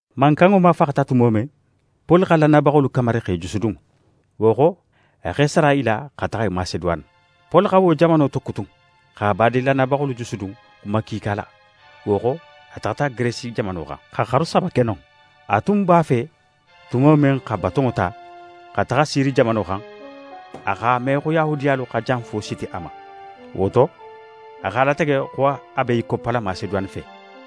Mankanŋo mafaxata tumo men, Poli xa lannayabaxolu kamari x'e jusudun. Wo xo, a x'é sara i la xa taxa Maseduwane. Poli xa wo jamano tokutun, xa badin lannayabaxolu jusudun xuma kiika la. Wo xo, a taxata Geresi jamano xan, xa xaru saba ke non. A tun b'a fe tumo men xa batonŋo ta, xa taxa Siri jamano xan, a x'a me xo Yahudiyalu xa janfo siti a ma. Wo to, a x'a latege xo a be í koppala Maseduwane fe.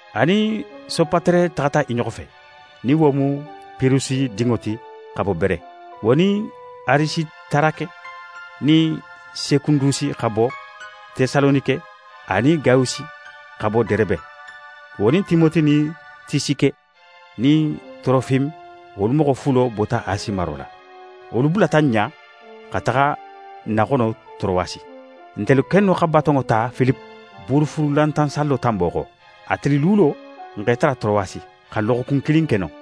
A nin Sopatere taxata i ɲoxo fe, nin wo mu Pirusi dinŋo ti xa bo Bere, wo nin Arisitarake nin Sekundusi xa bo Tesalonike, anin Gayusi xa bo Derebe, wo nin Timote nin Tisike nin Torofime, wolu moxo fulo bota Asi maro la. Wolu bulata n ɲa xa taxa n naxono Torowasi. Ntelu kennu xa batonŋo ta Filipe, Buurufuunulantan sallo tanbo xo. A tili luulo, n x'e tara Torowasi, xa loxokun kilin ke non.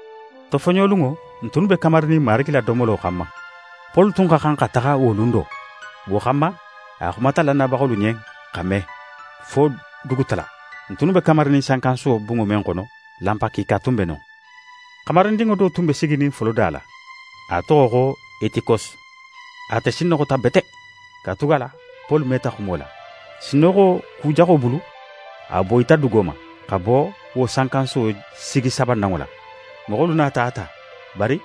Tofoɲolunŋo, n tunnu be kamarinin Marigi la domolo xanma; Poli tun xa xan xa taxa wo lun do. Wo xanma, a xumata lannayabaxolu ɲen, xa me, fo dugutala. N tunnu be kamarinin sankansuwo bunŋo men xono, lanpa kiika tun be non. Xamarindinŋo do tun be siginin foloda la, a toxo xo Etikose. Ate sinnoxota bete; katugala Poli meta xumo la. Sinnoxo kujaxo bulu, a boyita dugo ma, xa bo wo sankansuwo sigi sabananŋo la. Moxolu nata a ta, bari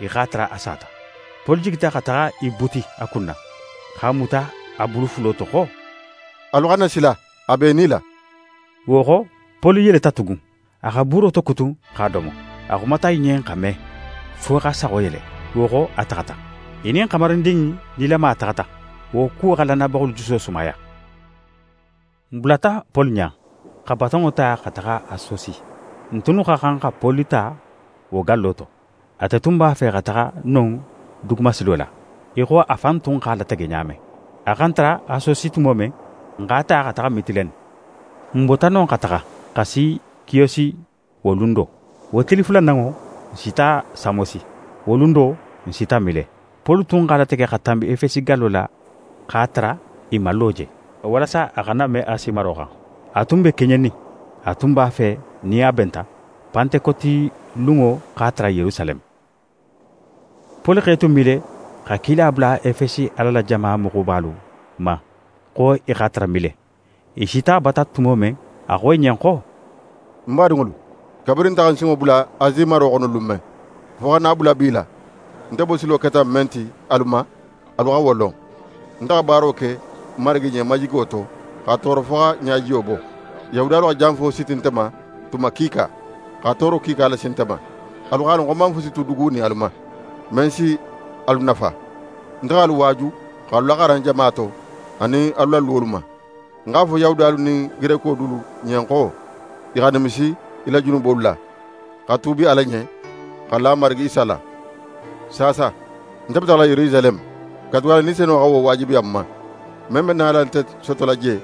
i x'a tara a sata. Poli jigita xa taxa í buti a kunna, x'a muta a bulu fulo to xo: «Alu xana sila, a be í nila.» Wo xo, Poli yeleta tugun. A xa buuro tokutun, x'a domo. A xumata i ɲen xa me, fo xa saxo yele. Wo xo, a taxata. I nin xamarindin in nilama taxata. Wo kuwo xa lannayabaxolu juso sumaya. N bulata Poli ɲa, xa batonŋo ta xa taxa Asosi. N tunnu xa xan xa Poli ta wo gallo to. Ate tun b'a fe xa taxa non dugumasilo la, í xo a fan tun x'a latege ɲa men. A xa n tara Asosi tumo men, n x'a ta xa taxa Mitilene. N bota non xa taxa, xa si Kiyosi wo lun do. Wo tili fulananŋo, n sita Samosi. Wo lun do, n sita Mile. Poli tun x'a latege xa tanbi Efesi gallo la x'a tara i man lo je, walasa a xana me Asi maro xan. A tun be keɲenin. A tun b'a fe nin a benta, Pantekoti lunŋo x'a tara Yerusaleme. Poli x'é tu Mile, xa kila bula Efesi Ala la jama moxobalu ma, xo i x'a tara Mile. I sita a bata tumo men, a xo i ɲen xo: «Ń badinŋolu, kabirin nte xa ń sinŋo bula Asi maro xono lun men, fo xa na a bula bi la, nte bosilo keta men ti alu ma, alu xa wo lon. Nte xa baaro ke Marigi ɲen majigo to, xa tooro fo xa ɲajiyo bo. Yahudiyalu xa janfo siti nte ma tuma kiika, xa tooro kiika lasi nte ma. Alu x'a lon xo ń man fusi tu dugunin alu ma, men si alu nafa. Nte x'alu waaju, x'alu laxaran jama to, anin alu la luwolu ma. Ń x'a fo Yahudiyalu nin Gereko dulu ɲen xo i xa nimisi i la junubolu la, xa tuubi Ala ɲen, xa la n Marigi Isa la. Saasa, nte be taxala Yerusaleme, katugala Ni Senunŋo xa wo waajibiya ń ma. Men be nala nte sotola je,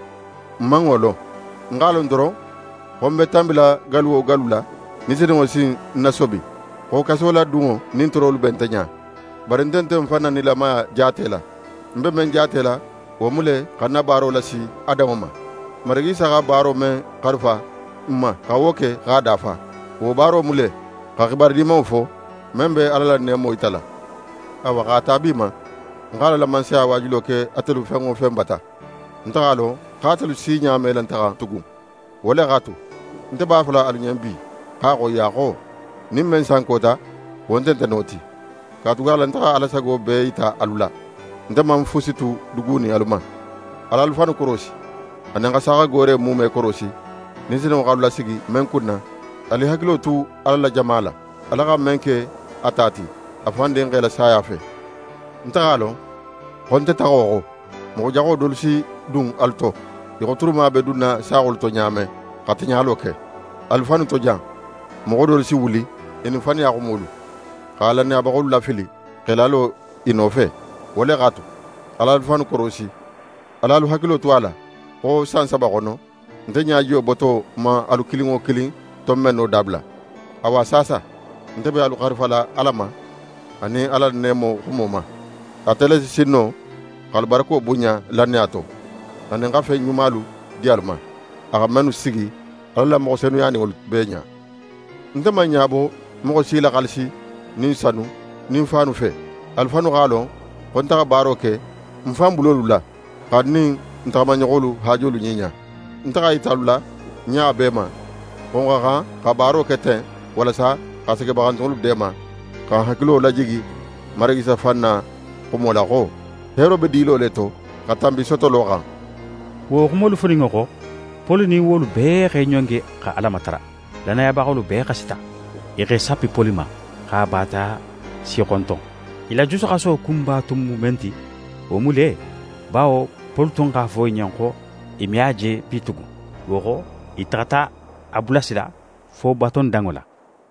ń man wo lon. Ń x'a lon doron xo ń be tanbila gallu wo gallu la, Ni Senunŋo si ń nasobi xo kasoladunŋo nin toorolu be nte ɲa. Bari nte nte ń fan na nilamaya jaatela. Ń be men jaatela, wo mu le xa ń na baaro lasi a danŋo ma. Marigi Isa xa baaro men xarifa ń ma xa wo ke x'a dafa. Wo baaro mu le, xa xibaru Dimanŋo fo, men be Ala la neemo yitala. «Awa, x'a ta bi ma, ń xa Ala la Mansaya waajulo ke atelu fen wo fen bata, nte x'a lon xo atelu si ɲa me la nte xan tugun. Wo le x'a tu, nte b'a fola alu ɲen bi x'a xoyiya xo: Nin men sankota, wo nte nte no ti. Katugala nte xa Ala sago bee yita alu la, nte man fusi tu dugunin alu ma. Al'alu fannu korosi, anin xa saaxagoore muume korosi, Ni Senunŋo x'alu lasigi men kunna. Alu i hakilo tu Ala la jama la, Ala xa men ke a ta ti, a fan Dinxe la saya fe. Nte x'a lon, xo nte taxo xo, moxo jaxo dolu si dun alu to, í xo turuma be dunna saaxolu to ɲa men xa tiɲalo ke. Alu fannu to jan, moxo dolu si wuli i nin faniya xumolu, xa lannayabaxolu lafili, x'e lalo i nofe. Wo le x'a tu, al'alu fannu korosi. Al'alu hakilo tu a la xo san saba xono, nte ɲajiyo boto man alu kilin wo kilin tonbenno dabula. «Awa saasa, nte be alu xarifala Ala ma, anin a la neemo xumo ma. Ate le si sin no x'alu barako bunɲa lannaya to, anin xa fen ɲumalu di alu ma, a xa mennu sigi a la moxo senuyaninŋolu bee ɲa. Nte man ɲabo moxo si la xaalisi nin sanu nin faanu fe. Alu fannu x'a lon xo nte xa baaro ke ń fan bulolu la, xa ń nin ń taxamaɲoxolu haajolu ɲiɲa. Nte x'a yita alu la ɲa bee ma, xo n xa xan xa baaro ke ten walasa xa segebaxantunŋolu deema, xa n hakilo lajigi Marigi Isa fan na xumo la xo: “Heero be dilo le to, xa tanbi sotolo xan.”» Wo xumolu foninŋo xo, Poli nin wolu bee x'e ɲongi xa Ala matara. Lannayabaxolu bee xasita. I x'e sappi Poli ma, x'a baataya sixonton. I la jusuxaso kunba tun mu men ti, wo mu le, bawo Poli tun x'a fo i ɲen xo i me a je bitugun. Wo xo, i taxata a bulasila fo batondanŋo la.